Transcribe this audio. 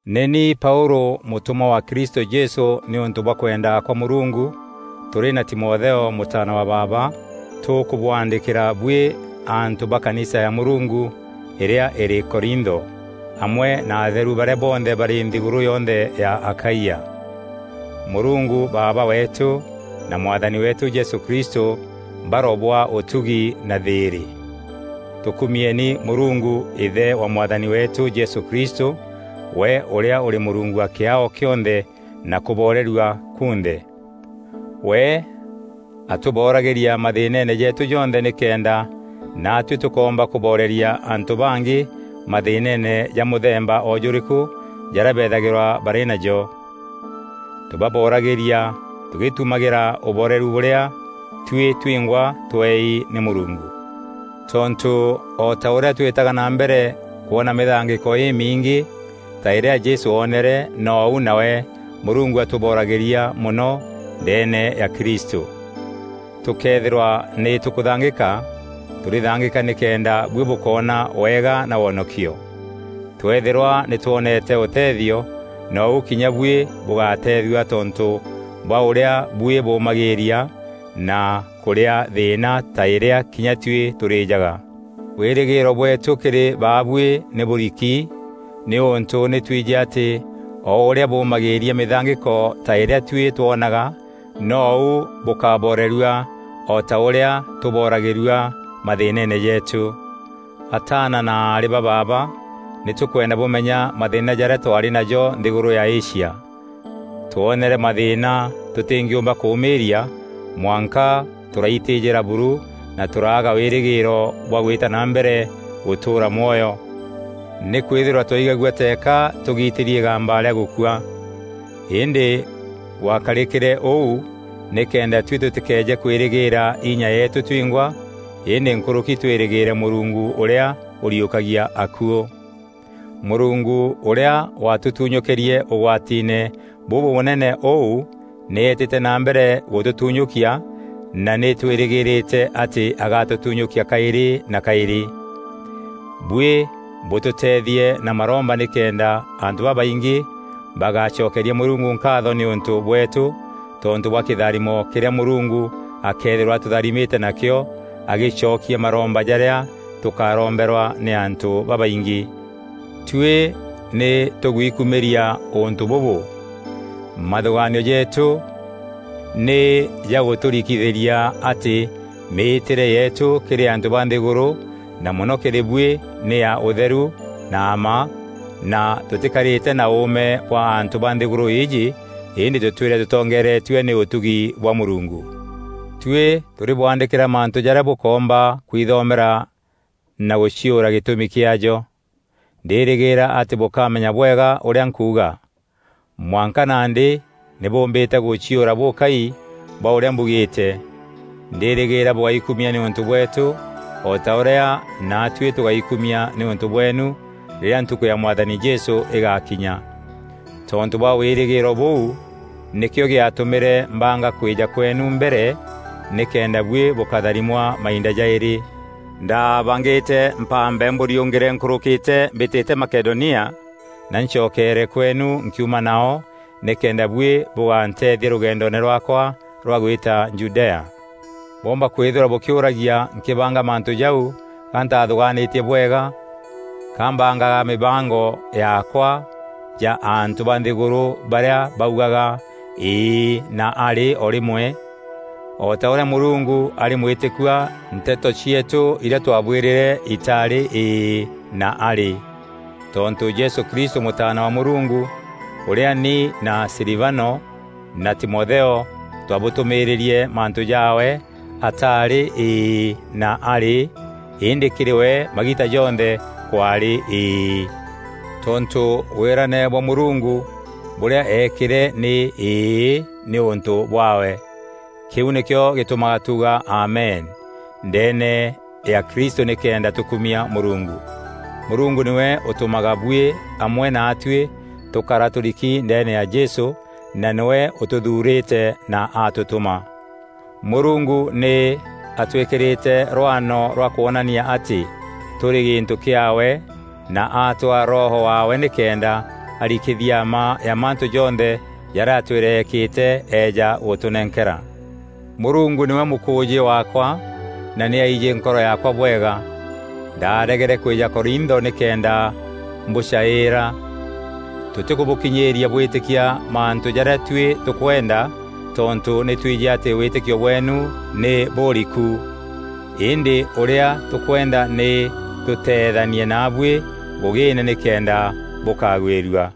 Nî ni Paûlû mûtûmwa wa Kristû Jesû nîûntû bwa kwenda kwa Mûrungu, tûrî na Timotheo mûtaana wa baaba, tûkûbwaandîkîra buî antû ba kanisa ya Mûrungu îrîa îrî Korintho, amwe na atheru barîa bonthe barî nthîgûrû yonthe ya Akaia. Mûrungu Baaba weetû na Mwathani weetû Jesû Kristû barobwaa ûtugi na thîîrî. Tûkumieni Mûrungu, Îthe wa Mwathani weetû Jesû Kristû we ûrîa ûrî Mûrungu wa kîaao kîonthe na kûborerua kunthe. We atûboragîria mathîînene jeetû jonthe nîkenda naatuî tûkoomba kûboreria antû bangî mathîînene ja mûthemba o jûrîkû jarîa beethagîrwa barî najo. Tûbaboragîria tûgîtumagîra ûboreru bûrîa tuî twingwa tweei nî Mûrungu. Tontû o ta ûrîa twîtaga na mbere kwona mîthangîko îmingî ta îrîa Jesû oonere, nou nawe Mûrungu atûboragîria mono ndeene ya Kristû. Tûkëethîrwa nî tûkûthangîka, tûrîthangîka nîkenda buî bûkoona wega na wonokio. Tweethîrwa nî twonete ûtethio, nou kinya buî bûgateethua tontû bwa ûrîa buî bûmagîîria na kûrîa thîîna ta îrîa kinya tuî tûrîjaga. Wîrîgîîro bweetû kîrî baabuî nî bûûriki, nîûntû nî tûîjî atî o ûrîa bûmagîîria mîthangîko ta îrîa tuî twonaga nou bûkaborerua o ta ûrîa tûboragîrua mathîînene jeetû. Ataana na aarî ba baaba nî tûkwenda bûmenya mathîîna jarîa twaarî najo nthîgûrû ya Asia. Twoonere mathîîna tûtîngîûmba kûmîîria mwanka tûraitîjîra buru na tûraaga wîrîgîîro bwa gwîta na mbere gûtûûra mwoyo. Nîkwîthîrwa twaigagua teeka tûgitîri îgamba rîa gûkua. Îndî gwakarîkîre ûu nîkenda tuî tûtîkeeje kwîîrîgîîra inya yeetû twingwa îndî nkûrûki twîrîgîîre Mûrungu ûrîa ûriûkagia akuû. Mûrungu ûrîa watûtunyûkîrie ûgwatiine bûbûnene ûu nî eetîte na mbere gûtûtunyûkia na nî twîrîgîrîte atî agatûtunyûkia kaîrî na kaîrî. Buî bûtûteethie na maromba nîkenda antû babaingî bagacokeria Mûrungu nkaatho nîûntû bweetû tontû bwa kîtharimo kîrîa Mûrungu akeethîrwa atûtharimîte nakîo agîcokia maromba jarîa tûkaromberwa nî antû babaingî. Tuî nî tûgwikumîria ûntû bûbû: mathûgaanio jeetû nî jagûtûrikithîria atî mîîtîre yeetû kîrî antû ba nthîgûrû na mono kîrî bûî nî ya ûtheru na mma na tûtîkarîte na ûûme bwa antû ba nthîgûrû îîjî îndî tûtwîre tûtongeretue nî ûtugi bwa Mûrungu. Tuî tûrîbwaandîkîra mantû jarîa bûkoomba kwithomera na gûciûra gîtûmi kîaajo. Ndîrîgîîra atî bûkamenya bwega ûrîa nkuuga. Mwanka nandî nî bûûmbîte gûciûra bûkai bwa ûrîa mbugîîte. Ndîrîgîîra bûgaikumia nîûntû bweetû o ta ûrîa naatuî tûgaikumia nîûntû bweenu rîrîa ntukû ya Mwathani Jesû îgakinya. Tontû bwa wîrîgîîro bûu, nîkîo gîatûmîre mbanga kwîîja kweenu mbere nîkenda buî bûkatharimwa mainda jaîrî. Ndaabangîte mpambe mbûriûngîre nkûrûkîte mbîtîte Makedonia na ncokeere kweenu nkiuma nao nîkenda buî bûganteethia rûgendoone rwaakwa rwa gwîta Judea. Bwoomba kwîthîrwa bûkîûragia nkîbanga mantû jau ga ntathûgaanîtie bwega? Ka mbangaga mîbango yaakwa ja antû ba nthîgûrû barîa baugaga “îî” na “arî” o rîmwe? O ta ûrîa Mûrungu arî mwîtîkua nteto cieetû irîa twabwîrîre itaarî “Îî” na “arî.” Tontû Jesû Kristû Mûtaana wa Mûrungu, ûrîa ni na Silivano na Timotheo twabûtûmîîrîrie mantû jaawe ataarî “Îî” na “arî” îndî kîrî we magiita jonthe kwaarî “Îî.” Tontû wîrane bwa Mûrungu, bûrîa eekîre nî “Îî” nîûntû bwaawe. Kîu nîkîo gîtûmaga tuuga “Amen” ndeene ya Kristû nîkenda tûkumia Mûrungu. Mûrungu nîwe ûtûmaga buî amwe naatuî tûkara tûriki ndeene ya Jesû, na nîwe ûtûthuurîte na atûtûma. Mûrungu nî atwîkîrîte rwano rwa kwonania atî tûrî gîntû kîaawe na atwaa Roho waawe nîkenda arikithia mma ya mantû jonthe jarîa atwîre eekîte eeja gûtûnenkera. Mûrungu nîwe mûkûûjî waakwa na nî aijî nkoro yaakwa bwega. Ndaaregere kwîja Korintho nîkenda mbûcaîîra. Tûtîkûbûkinyîîria bwîtîkia mantû jarîa tuî tûkwenda tontû nî twijî atî wîtîkio bweenu nî bûriku. Îndî ûrîa tûkwenda nî tûteethanie naabuî ngûgîîne nîkenda bûkagwîrua.